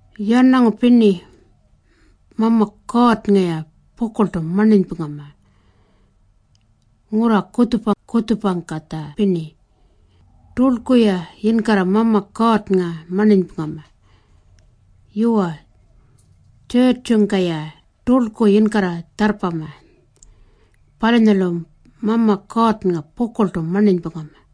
Yarnangu pirni, Mama Kuurrnga-ya pukurltu marninypungama. Ngurra kutjupa-kutjupangkatja pirni, turlku-ya yinkarra Mama Kuurrnga marninypungama. Yuwa, tjurrtjungka-ya turlku yinkarra tjarrpama. Palunyalu Mama Kuurrnga pukurltu marninypungama.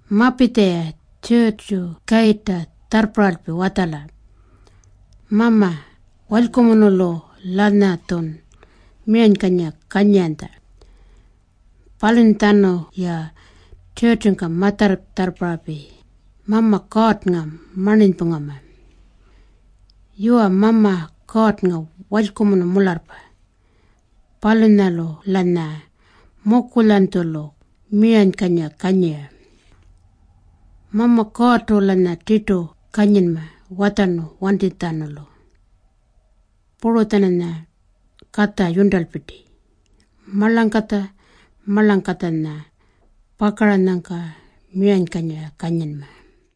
Mapitja-ya tjurrtju kayirrpangka tjarrparralpi watjala, “Mama, walykumunulu-lanyatjun miranykanyira kanyiranytja.” Palunyatjanulu-ya tjurrtjungka ma-tjarrparralpi Mama Kuurrnga marninypungkuma. Yuwa, Mama Kuurrnga walykumunu mularrpa. Palunyalu-lanya mukulyanytjulu miranykanyira kanyira. Mama Kuurrtu-lanya tirtu kanyinma watjarnu wantinytjatjanulu. Puru-tjananya katja yurntalpirti marlangkatja-marlangkatjanya pakaranyangka miranykanyira kanyinma.